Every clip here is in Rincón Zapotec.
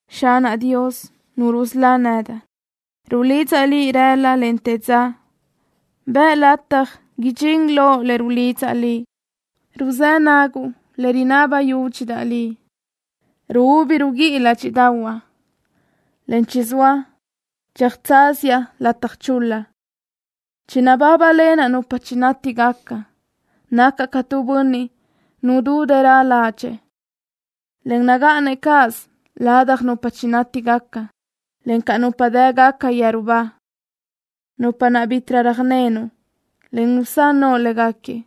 Xanaʼ Dios, Nu rusölá nedaʼ, rulidzaʼ Liʼ rëla, en te dza. Bëʼ lataj idxín loʼ le rulidzaʼ Liʼ. Ruzë́ naguʼ le rinaba yúdxidaʼ Liʼ. Ruúbi ruguíʼi ládxiʼdaʼahuaʼ, en chizóa tsöjtsáziaʼ lataj chul-la. Chinabábalenaʼ nupa chinátigaca. Nacaʼ ca tu bönniʼ nudú dërö ládxëʼë, en nagáʼanëʼ cáʼasö ladaj nupa chinátigaca, en ca nupa dë́gaca yeru ba, nupa naʼ bítiʼrö röjnenuʼ, en nusán noʼo léguequi.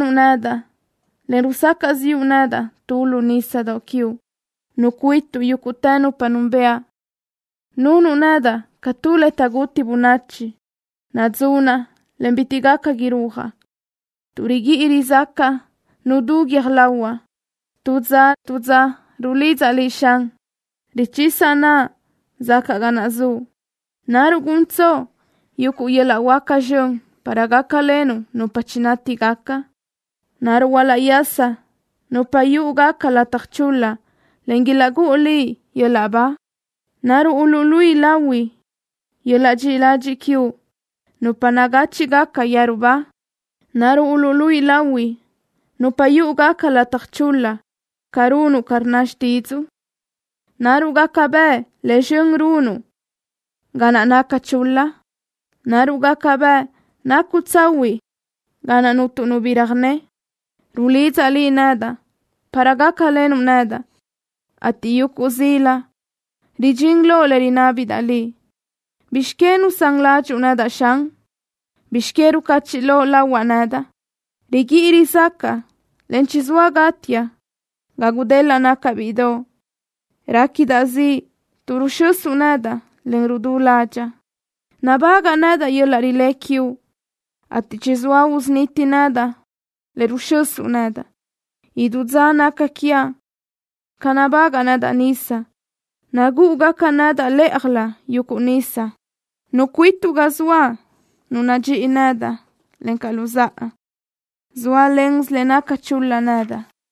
Rilenuʼ nedaʼ, en rusacaʼ ziʼu nedaʼ tu lu nísadoʼ quiuʼ. Nucuásuʼ yúguʼtë nupa núnbëʼa. Nunuʼ nedaʼ ca tu le taʼguti bönachi. Nadzunaʼ, en bitiʼ gaca irúajaʼ. Tuʼ riguíʼi rizácaʼa nudú guiö́j lahuaʼ. Tu dza tu dza rulidzaʼ Liʼ, Xan. Richisa naʼa zacaʼ ga naʼ zuʼ. ¿Naruʼ guntsoʼ yuguʼ yöl-laʼ huáca zxön para gácalenuʼ nupa chinátigaca? ¿Naruʼ uluʼyasa nupa yúʼugaca lataj chul-la, en ilaʼgúʼu Liʼ yöl-laʼ ba? ¿Naruʼ uluʼluíʼi lahui yöl-laʼ dxiʼi ladxiʼ quiuʼ nupa nagáchiʼgaca yeru ba? ¿Naruʼ uluʼluíʼi lahui nupa yúʼugaca lataj chul-la ca runuʼ ca rnna xtídzuʼu? ¿Naruʼ gaca bëʼ le zxön runuʼ ga naʼ naca chul-la? ¿Naruʼ gaca bëʼ nacuʼ tsahuiʼ ga naʼ cuntu nu bi röjné? Rulidzaʼ Liʼ nedaʼ para gácalenuʼ nedaʼ, ateʼ yuguʼ zila ridxín loʼ le rinábidaʼ Liʼ. ¿Bizx que nusán ládxuʼu nedaʼ, Xan? ¿Bizx que rucachiʼ loʼ lahuaʼ nedaʼ? Riguíʼi rizácaʼa, en chizóa gátiaʼ ga gudelaʼ nacaʼ bíʼidoʼ. Réquidaʼ ziʼ tuʼ ruxösuʼ nedaʼ, en rudú ládxaʼa. Nabágaʼa nedaʼ yöl-laʼ rilé quiuʼ, ateʼ chizóa usuniti nedaʼ le ruxösuʼ nedaʼ. Idú dza naca quiaʼ ca nabagaʼ nedaʼ nisa. Nagúʼugaca nedaʼ lë́ʼajlö yuguʼ nisa. Nucuásuʼ ga zoaʼ nu nadxíʼi nedaʼ, encaʼ luzáʼa. Zóalensö le naca chul-la nedaʼ.